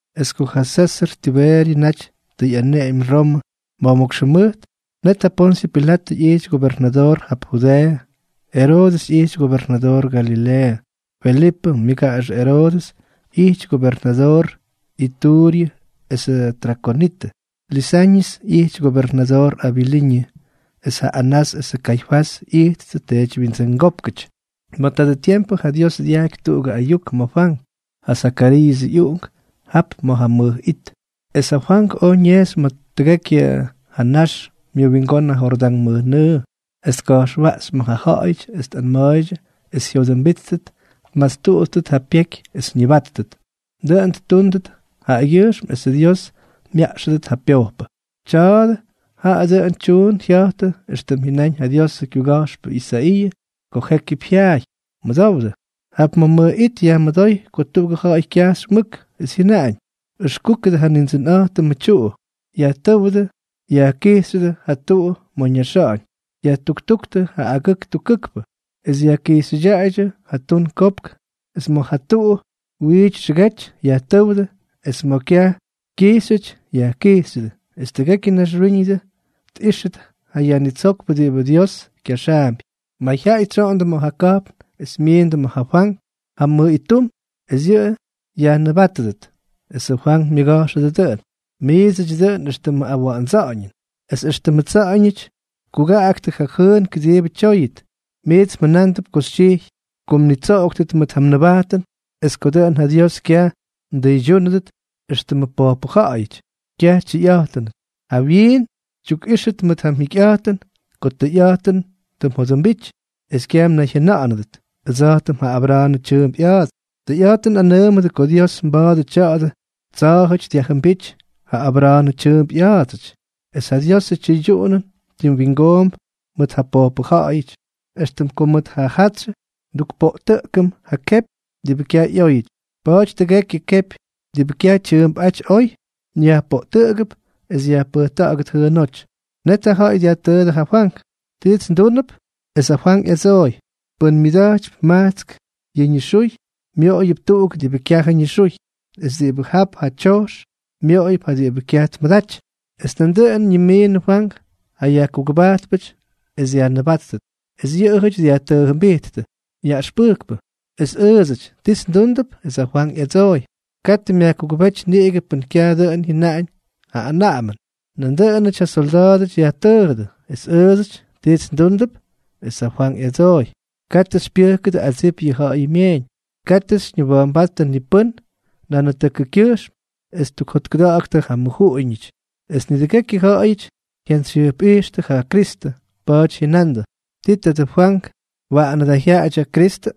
Es ko ja Sésʉr Tibeeryʉ naty tʉ ꞌyaneꞌemy Romʉ ma̱jmókx jʉmʉjt, net ja Ponsyʉ Pilatʉ ꞌyijty gobernadoor jap Judeeʉ, Eroodʉs ꞌyijty gobernadoor Galileeʉ, Felipʉ myʉgaꞌaxʉ Eroodʉs ꞌyijty gobernadoor Ituuryʉ esʉ Trakonitʉ, Lisañʉs ꞌyijty gobernadoor Abiliñʉ, es ja Anás es ja Kaifás ꞌyijttʉ teedywyindsʉngópkʉty. Ma̱ tadʉ tiempʉ ja Dios dyajky tuꞌugʉ ayuk ma̱ Fwank, ja Zakariiʉsʉ ꞌyuꞌunk, jap ma̱ ja mʉj it. Es ja Fwank oj ñejxy ma̱ tʉgekyʉ ja nax myʉwingón ja Jordán mʉjnʉʉ, es tka̱jxwaꞌxy ma̱ ja ja̱ꞌa̱yʉty es tꞌanma̱a̱ydyʉ es jyodʉmbíttʉt, tmastuꞌuttʉt ja pyeky es ñʉbátʉt. Dʉꞌʉn ttúndʉt jaꞌagyʉjxm esʉ Dios myaꞌxʉdʉt ja pyojpʉ. Tya̱a̱dʉ jaꞌa dʉꞌʉn tyuun jya̱jtʉ éxtʉm jyʉnáñ ja Diosʉ kyuga̱jxpʉ Isaiiʉ ko jékyʉp jyaay: Mʉdowdʉ. Jap ma̱ mʉj it yajmʉdóy ko tuꞌugʉ ja̱ꞌa̱y kyajxy mʉk, es jyʉnaꞌañ: “Ʉxkúkʉdʉ ja Nindsʉnꞌa̱jtʉmʉ tyuꞌu. Ta̱jtʉ́wdʉ, yajkijxyʉdʉ ja tuꞌu ma̱ ñaxa̱ꞌa̱ñ. Yajtuktúktʉ yʉ agʉk tukkʉkpʉ, es yajkijxyʉdyaꞌaydyʉ ja tun kopk. Es ma̱ ja tuꞌu wiity xʉgety, yajtʉ́wdʉ, es ma̱ kyaj kyijxyʉty, yajkijxyʉdʉ. Es tʉgekyʉ naxwíñʉdʉ tꞌíxʉt ja Yajnitsókpʉ diꞌibʉ Dios kyaxaampy.” Mayjyaꞌay tsyoꞌondʉ ma̱ ja ka̱jpn es myiindʉ ma̱ ja Fwank jam mʉj ittum es yʉꞌʉ yajnʉbátʉdʉt. Es ja Fwank myʉga̱jxʉ dʉꞌʉn: —Miidsʉty dʉꞌʉn éxtʉmʉ awa̱ꞌa̱ndsa̱ꞌa̱ñʉn. Es éxtʉmʉ tsa̱ꞌa̱ñʉty tkugaꞌaktʉ ja jʉʉn kʉdiibʉ tyóyʉt, miits mjʉnándʉp xytyijy ko mnitsoꞌoktʉt mʉt ja mnʉbajtʉn es ko dʉꞌʉn ja Dios kyaj mdʉydyúnʉdʉt éxtʉmʉ pojpʉ ja̱ꞌa̱yʉty. ¡Kyaj tyʉyꞌa̱jtʉnʉty! Jawyiin xytyukꞌíxʉt mʉt ja mjikyꞌa̱jtʉn ko tʉyꞌa̱jtʉn tʉ mjodʉmbity, es kyaj mnayjyʉna̱ꞌa̱nʉdʉt: “Ʉdsa̱jtʉm ja Abra̱a̱nʉ tyʉʉmp ꞌya̱a̱ts.” Tʉyꞌa̱jtʉn nꞌanʉʉmʉdʉ ko Dios mba̱a̱dʉ tya̱dʉ tsa̱a̱jʉty dyajjʉmbíty ja Abra̱a̱nʉ tyʉʉmp ꞌya̱a̱dsʉty. Es ja Diosʉ tyʉydyuꞌunʉn tim wingoomp mʉt ja pojpʉ ja̱ꞌa̱yʉty, éxtʉm ko mʉt ja jatsyʉ ndukpoꞌtʉꞌkʉm yʉ kepy diꞌibʉ kyaj ꞌyóyʉty. Pa̱a̱ty tʉgekyʉ kepy diꞌibʉ kyaj tyʉʉmpꞌáty oy, yajpoꞌtʉꞌʉgʉp es yajpʉjta̱ꞌa̱gʉt jʉʉnóty. Net ja ja̱ꞌa̱y dyajtʉʉdʉ ja Fwank: —¿Tiits ndúndʉp? Es ja Fwank ꞌyadsooy: —Pʉn myʉda̱jtypy majtsk yʉ ñixuy, myoꞌoyʉp tuꞌuk diꞌibʉ kyajʉ ñixuy. Es diꞌibʉ jap ja tyojx, myoꞌoyʉp ja diꞌibʉ kyaj tmʉdaty. Es nandʉꞌʉn ñimiinʉdʉ Fwank ja yajkugʉbajtpʉty es dyajnʉbáttʉt. Es yʉꞌʉjʉty dyajtʉʉjʉmbijttʉ: —Yaꞌʉxpʉjkpʉ, es ʉʉdsʉty, ¿tiits ndúndʉp? Es ja Fwank ꞌyadsooy: —Katʉ myajkugʉbéty niꞌigʉ pʉn kyajʉ dʉꞌʉn jyʉnaꞌañ ja anaꞌamʉn. Nandʉꞌʉnʉty ja solda̱a̱dʉty yajtʉʉjʉdʉ: —Es ʉʉdsʉty, ¿tiits ndúndʉp? Es ja Fwank ꞌyadsooy: —Katʉ xypyʉjkʉdʉ adsip yʉ ja̱ꞌa̱yʉ myeeñ. Katʉ xyñiwa̱a̱mbáttʉ ni pʉ́n nanatʉkʉkyʉjxm es tukjotkʉda̱ꞌa̱ktʉ ja mmʉjuꞌuñʉty. Es nidʉgekyʉ ja̱ꞌa̱yʉty tjantsyjyʉjpꞌijxtʉ ja Kristʉ. Pa̱a̱ty jyʉnandʉ: —¿Ti tadʉ Fwank, waꞌanʉ da jyaꞌadyʉ Kristʉ?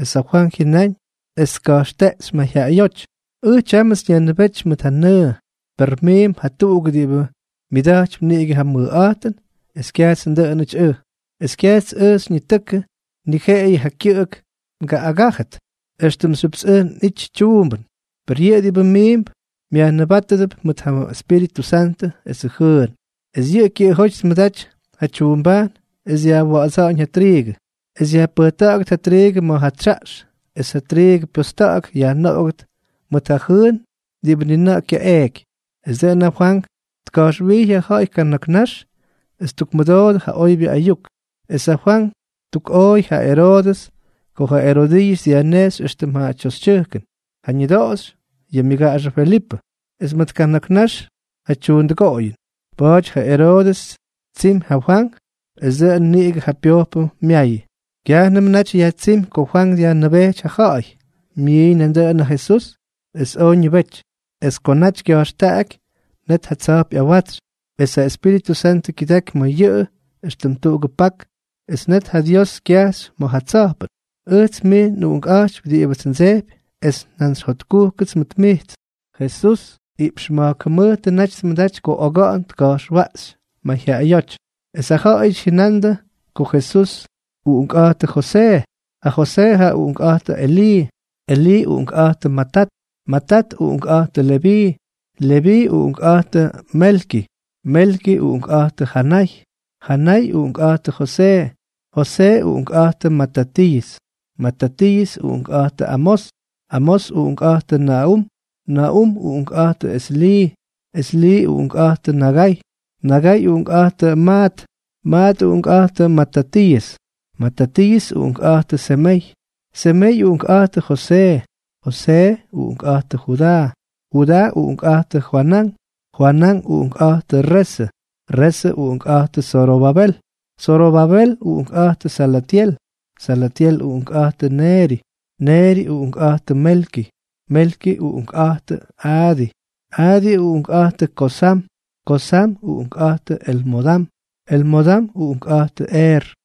Es ja Fwank jyʉnáñ es tka̱jxteꞌxy mayjyaꞌayóty: —Ʉj tyámʉts nyajnʉbéty mʉt ja nʉʉ. Per miimp jatuꞌuk diꞌibʉ myʉda̱jtypy niꞌigʉ ja mʉkꞌa̱jtʉn es kyajts ndʉꞌʉnʉty ʉj. Es kyajts ʉj xyñitʉkʉ, ni jeꞌeyʉ yʉ kyʉꞌʉk ngaꞌꞌagájʉdʉt éxtʉmxyʉpts ʉj nꞌítyʉts tyuumbʉn. Per yʉꞌʉ diꞌibʉ miimp myajnʉbátʉdʉp mʉt ja Espíritʉ Santʉ esʉ jʉʉn. Es yʉꞌʉ kyʉꞌʉjóty tmʉdaty ja tyuumbajn es dyajwa̱ꞌa̱dsa̱ꞌa̱ñ ja triigʉ, es yajpʉjkʉꞌʉgʉt ja triigʉ ma̱ ja tsyaꞌx es ja triigʉ pyosta̱ꞌa̱k yajnoꞌogʉt mʉt ja jʉʉn diꞌibʉ ni na̱ꞌa̱ kyaꞌeeky. Es dʉꞌʉn ja Fwank tka̱jxwijy ja ja̱ꞌa̱y kana̱k nax es ttukmʉdoodʉ ja oybyʉ ayuk. Es ja Fwank ttukꞌooy ja Eroodʉs ko ja Erodiiʉs dyajnejxy éxtʉm ja tyoxytyʉjkʉn, ja ñʉdoꞌoxy yʉ myʉgaꞌaxʉ Felipʉ, es mʉt kana̱k nax ja tyuundʉgoꞌoyʉn. Pa̱a̱ty ja Eroodʉs ttsiimy ja Fwank es dʉꞌʉn niꞌigʉ ja pyojpʉ myayʉ. Kyajnʉmʉ naty yajtsímy ko Fwank dyajnʉbéty ja ja̱ꞌa̱y, myiiñ nandʉꞌʉn ja Jesús es oj ñʉbety. Es ko naty kya̱jxtaꞌaky, net ja tsa̱jp ꞌyawatsy, es ja Espíritʉ Santʉ kyʉdaky ma̱ yʉꞌʉn éxtʉm tuꞌugʉ pak, es net ja Dios kyajxy ma̱ ja tsa̱jpʉn: —Ʉjts mij nꞌUꞌunkꞌa̱jtypy diꞌibʉts ndsejpy es jantsy jotkujkʉts mʉt mijts. Jesús iꞌpx ma̱jk jʉmʉjtʉ naty tmʉdaty ko oga̱ꞌa̱n tka̱jxwaꞌxy mayjyaꞌayóty. Es ja ja̱ꞌa̱yʉty jyʉnandʉ ko Jesús uꞌunkꞌa̱jtʉ Josee. Ja Josee jaꞌa uꞌunkꞌa̱jtʉ ja Elii, Elii uꞌunkꞌa̱jtʉ Matat, Matat uꞌunkꞌa̱jtʉ Leví, Leví uꞌunkꞌa̱jtʉ Melki, Melki uꞌunkꞌa̱jtʉ Janay, Janay uꞌunkꞌa̱jtʉ Josee, Josee uꞌunkꞌa̱jtʉ Matatiiʉs, Matatiiʉs uꞌunkꞌa̱jtʉ Amós, Amós uꞌunkꞌa̱jtʉ Naꞌum, Naꞌum uꞌunkꞌa̱jtʉ Eslii, Eslii uꞌunkꞌa̱jtʉ Nagay, Nagay uꞌunkꞌa̱jtʉ Maat, Maat uꞌunkꞌa̱jtʉ Matatiiʉs, Matatiiʉs uꞌunkꞌa̱jtʉ Semey, Semey uꞌunkꞌa̱jtʉ Josee, Josee uꞌunkꞌa̱jtʉ Judaa, Judaa uꞌunkꞌa̱jtʉ Joanán, Joanán uꞌunkꞌa̱jtʉ Resʉ, Resʉ uꞌunkꞌa̱jtʉ Zorobabel, Zorobabel uꞌunkꞌa̱jtʉ Salatyel, Salatyel uꞌunkꞌa̱jtʉ Neeri, Neeri uꞌunkꞌa̱jtʉ Melki, Melki uꞌunkꞌa̱jtʉ Adii, Adii uꞌunkꞌa̱jtʉ Kosam, Kosam uꞌunkꞌa̱jtʉ Elmodam, Elmodam uꞌunkꞌa̱jtʉ Eer,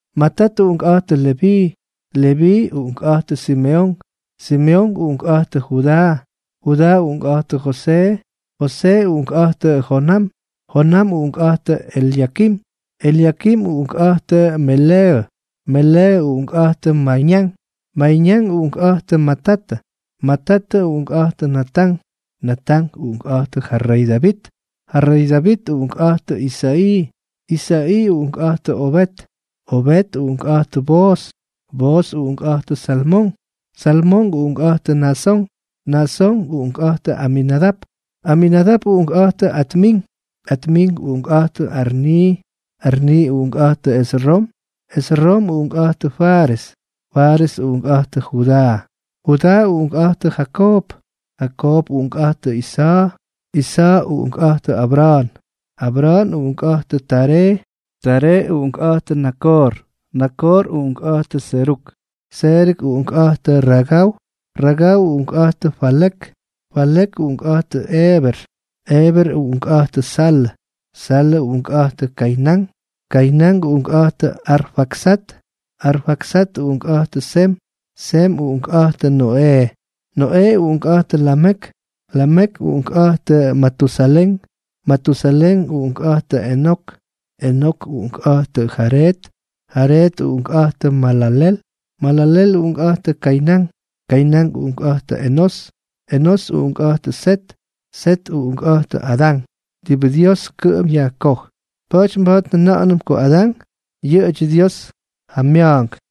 Matat uꞌunkꞌa̱jtʉ Leví, Leví uꞌunkꞌa̱jtʉ Simeonk, Simeonk uꞌunkꞌa̱jtʉ Judaa, Judaa uꞌunkꞌa̱jtʉ Josee, Josee uꞌunkꞌa̱jtʉ Jonam, Jonam uꞌunkꞌa̱jtʉ Elyakim, Elyakim uꞌunkꞌa̱jtʉ Meleeʉ, Meleeʉ uꞌunkꞌa̱jtʉ Mayñán, Mayñán uꞌunkꞌa̱jtʉ Matatʉ, Matatʉ uꞌunkꞌa̱jtʉ Natán, Natán uꞌunkꞌa̱jtʉ ja rey Davit, ja rey Davit uꞌunkꞌa̱jtʉ Isa̱ꞌii, Isa̱ꞌii uꞌunkꞌa̱jtʉ Obeed, Obeed uꞌunkꞌa̱jtʉ Booz, Booz uꞌunkꞌa̱jtʉ Salmón, Salmón uꞌunkꞌa̱jtʉ Naasón, Naasón uꞌunkꞌa̱jtʉ Aminadap, Aminadap uꞌunkꞌa̱jtʉ Admín, Admín uꞌunkꞌa̱jtʉ Arnii, Arnii uꞌunkꞌa̱jtʉ Esrom, Esrom uꞌunkꞌa̱jtʉ Fares, Fares uꞌunkꞌa̱jtʉ Judaa, Judaa uꞌunkꞌa̱jtʉ Jakoob, Jakoob uꞌunkꞌa̱jtʉ Isa̱a̱, Isa̱a̱ uꞌunkꞌa̱jtʉ Abra̱a̱n, Abra̱a̱n uꞌunkꞌa̱jtʉ Taree, Taree uꞌunkꞌa̱jtʉ Nakoor, Nakoor uꞌunkꞌa̱jtʉ Seruk, Seruk uꞌunkꞌa̱jtʉ Ragau, Ragau uꞌunkꞌa̱jtʉ Falek, Falek uꞌunkꞌa̱jtʉ Eeber, Eeber uꞌunkꞌa̱jtʉ Salʉ, Salʉ uꞌunkꞌa̱jtʉ Kaynán, Kaynán uꞌunkꞌa̱jtʉ Arfaksat, Arfaksat uꞌunkꞌa̱jtʉ Sem, Sem uꞌunkꞌa̱jtʉ Noꞌee, Noꞌee uꞌunkꞌa̱jtʉ Lamek, Lamek uꞌunkꞌa̱jtʉ Matusalén, Matusalén uꞌunkꞌa̱jtʉ Enok, Enok uꞌunkꞌa̱jtʉ Jareed, Jareed uꞌunkꞌa̱jtʉ Malalel, Malalel uꞌunkꞌa̱jtʉ Kaynán, Kaynán uꞌunkꞌa̱jtʉ Enós, Enós uꞌunkꞌa̱jtʉ Set, Set uꞌunkꞌa̱jtʉ Adán, diꞌibʉ Dios kʉꞌʉm yajkoj. Pa̱a̱ty mba̱a̱t njʉna̱ꞌa̱nʉm ko Adán yʉꞌʉdyʉ Dios ja mya̱a̱nk.